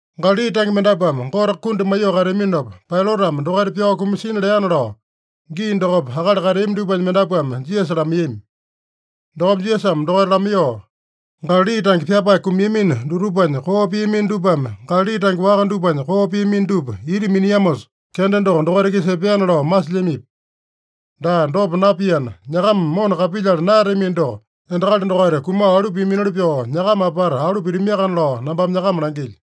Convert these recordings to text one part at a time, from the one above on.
Galali tange mendapuame Gote kundi maiyoo kateaminopa, Pailatame dokaita pyao kumasina leana lao, gii dokopa akali kateami dupanya mendapuame Jisasa lamaiyami. Dokopa Jisasame dokaita lamaiyoo, “Galali tange pyapae kumiamino dutupanya koo piamino dupame Galali tange waka dupanya koo piamino dupa ita miniamosa, kenda doko dokaita-kisa epeana lao masilyamipi? Daa, dopa napiana, nyakama mona kapilyala naeyatamino doko, endakali dokaita kumao alu piaminoli pyoo, nyakama apata alu pitamiakana lao nambame nyakama langilyo.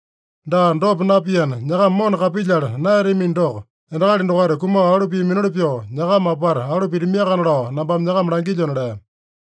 Daa, dopa napiana, nyakama mona kapilyala naeyatamino doko, endakali dokaita kumao alu piaminoli pyoo, nyakama apata alu pitamiakana lao nambame nyakama langilyona” lea.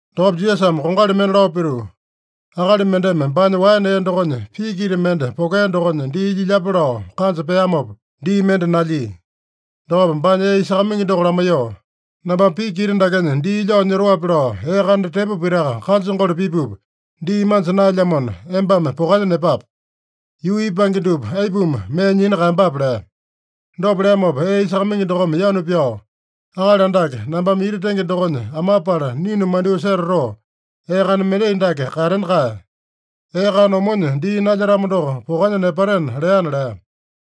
Dokopa Jisasame kongali mende lao pituu, “Akali mendeme baanya waene ee dokonya piki ita mende pokea dokonya dii lyilyape lao kanja peamopa, dii mende nalyia. Dokopa baanya ee isakamaingi doko lamaiyoo, ‘Nambame piki ita dakenya dii lyao nyotoape lao ee kana tepo pitaka kanjangole pipupa, dii manja naelyamona, embame pokanya nepape. Yuu ipange dupa aipuma mee nyina kaeyambape?’ lea. Dopa leamopa ee isakamaingi dokome yanu pyao, ‘Akali Andake, nambame ita tenge dokonya amapala ninu mandyoo setatoo, ee kana mendai dake katena kae. Ee kana omonya dii nalyetamo doko, pokanya nepatena’ leana” lea.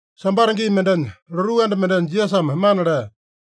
Sambata gii mendenya, lotuu anda mendenya Jisasame mana lea.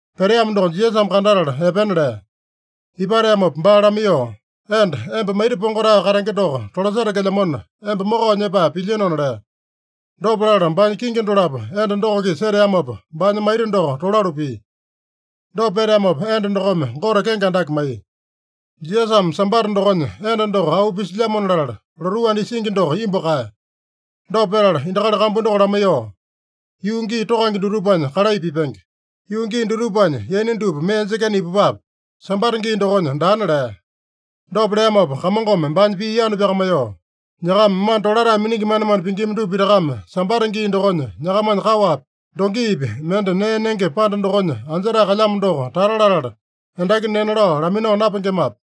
Peteamo doko Jisasame kandatala epena lea. Ipateamopa baa lamaiyoo, “Enda, emba maita pongotae katenge doko tolasetekelyamona, emba mokao nyepae pilyinona” lea. Dopa latala baanya kingi dolapo enda doko-kisa seteamopa, baanya maita doko tolalu pia. Dopa peteamopa enda dokome Gote kenge andake maiya. Jisasame Sambata dokonya enda doko auu pisilyamona latala, lotuu anda isingi doko imbu kaeya. Dopa petala endakali kambu doko lamaiyoo, “Yuu gii tokange dutupanya kalai pipenge. Yuu gii dutupanya yaina dupa mee jekena ipupape. Sambata gii dokonya daana” lea. Dopa leamopa Kamongome baanya pii yanu pyakamaiyoo, “Nyakama mana tolatae miningi manemane pingima dupa pitakame Sambata gii dokonya nyakamanya kaowapi, dongipi mende nee nenge panda dokonya anjetae kalyamo doko tata latala, endaki nena lao laminao napengemape?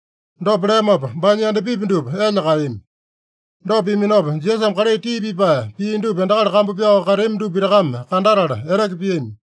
Dopa leamopa, baanya yandapipi dupa elya kaeyami. Dopa piaminopa, Jisasame kalai tii pipae pia dupa endakali kambu pyao kateami dupa pitakame kandatala eteke piami.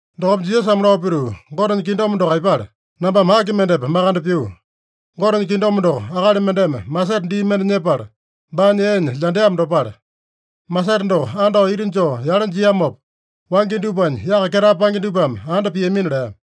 Dokopa Jisasame lao pituu, “Gotenya kingdom doko aipale? Nambame aki mendepa makande pyuu? Gotenya kingdom doko, akali mendeme masete dii mende nyepala, baanya eenya lyandeamo dopale. Masete doko andao ita joo yale jiamopa, wangya dupanya yaka ketae paenge dupame anda piamina” lea.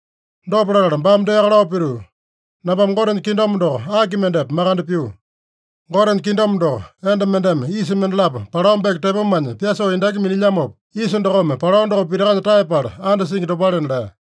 Dopa latala baame deaka lao pituu, “Nambame Gotenya kingdom doko aki mendepa makande pyuu? Gotenya kingdom doko, enda mendeme yisa mendalapo palao beke tepomanya pyasoo endaki minilyamopa, yisa dokome palao doko pitakanya taeyapala andasingi dopalena” lea.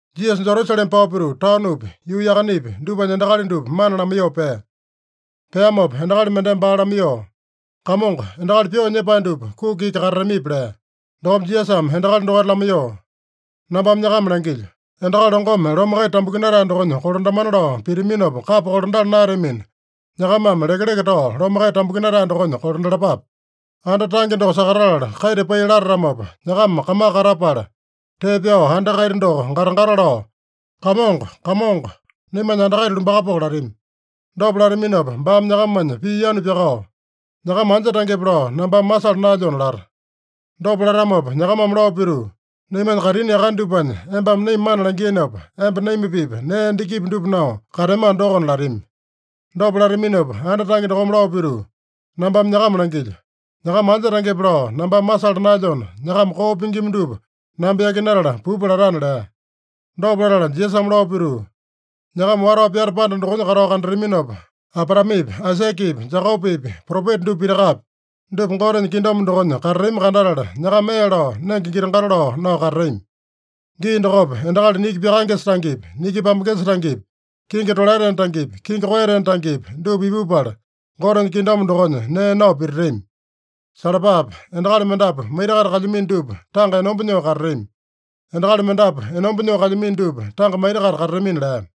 Jisasa Jerusalema pao pituu, taonopi, yuu yakanepi dupanya endakali dupa mana lamaiyoo pea. Peamopa endakali mendeme baa lamaiyoo, “Kamongo, endakali pyoo nyepae dupa kuki iki katatamipi?” lea. Dokopa Jisasame endakali dokaita lamaiyoo, “Nambame nyakama langilyo: Endakali longome lome kaita tambukinatae dokonya kolandamana lao pitaminopa kapa kolandala naeyatamina, nyakamame lekeleke tao lome kaita tambukinatae dokonya kolandalapape. Anda tange doko sakatatala kaita pai latatamopa, nyakama kamaka katapala, tee pyao anda kaita doko gata-gata lao, ‘Kamongo, Kamongo, naimanya anda kaita lumbakapoko’ latami. Dopa lataminopa baame nyakamanya pii yanu pyakao, ‘Nyakama anja tangepe lao nambame masala naelyona’ lata. Dopa latamopa nyakamame lao pituu, ‘Naimanya kaitini yakane dupanya embame naima mana langiinopa, emba naima-pipa nee endakipi dupa nao kateamano dokona’ latami. Dopa lataminopa anda tange dokome lao pituu, ‘Nambame nyakama langilyo: Nyakama anja tangepe lao nambame masala naelyona, nyakama koo pingima dupa namba yakinatala pupa’ latana” lea. Dopa latala Jisasame lao pituu, “Nyakama watao pyata panda dokonya katao kandataminopa, Abraamepi, Aisakepi, Jekopepi, propeta dupa pitakapi, dupa Gotenya kingdom dokonya katatami kandatala, nyakama ee lao, nenge giti-gato lao nao katatami. Gii dokopa endakali niki pyakaengesa tangepi, niki pambengesa tangepi, kingi tolaetena tangepi, kingi koeyatena tangepi, dupa ipupala Gotenya kingdom dokonya nee nao pititami. Salapape! Endakali mendapu maita-kaita kalyamino dupa tanga enomba nyoo katatami. Endakali mendapu enomba nyoo kalyamino dupa tanga maita-kaita katatamina” lea.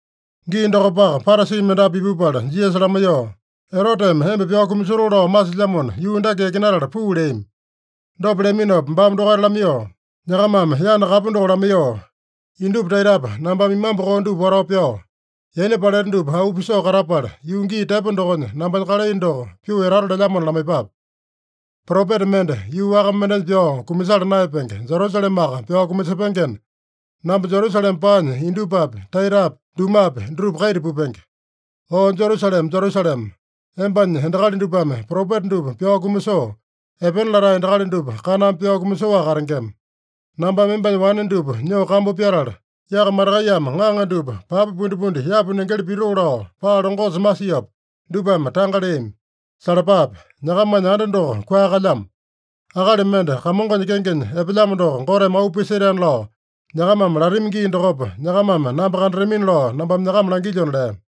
Gii dokopaka Parasi mendapu ipupala Jisasa lamaiyoo, “Eroteme emba pyao kumasotoo lao masilyamona, yuu dake yakinatala puu” leami. Dopa leaminopa baame dokaita lamaiyoo, “Nyakamame yana kapu doko lamaiyoo, ‘Indupa taitapa nambame imambu koo dupa watao pyao, yaina paleta dupa auu pisoo katapala, yuu gii tepo dokonya nambanya kalai doko pyoo etato lelyamona’ lamaiyepape. Propeta mende yuu waka mendenya pyao kumasala naeyapenge, Jerusalemaka pyao kumasepengena, namba Jerusalema paanya indupapi, taitapi, dumapi dutupa kaita pupenge. O Jerusalema, Jerusalema! Embanya endakali dupame propeta dupa pyao kumasoo, epena latae endakali dupa kaname pyao kumasoaka katengema. Nambame embanya wane dupa nyoo kambu pyatala, yaka matakaiyame ŋaŋa dupa papa pundipundi yapu nengeli pitoo lao, paa longosa masiopa, dupame tanga leami. Salapape! Nyakamanya anda doko kua kalyamo. ‘Akali mende Kamongonya kengenya epelyamo doko Goteme auu pisetaena’ lao nyakamame latami gii dokopa, nyakamame namba kandatamina lao nambame nyakama langilyona” lea.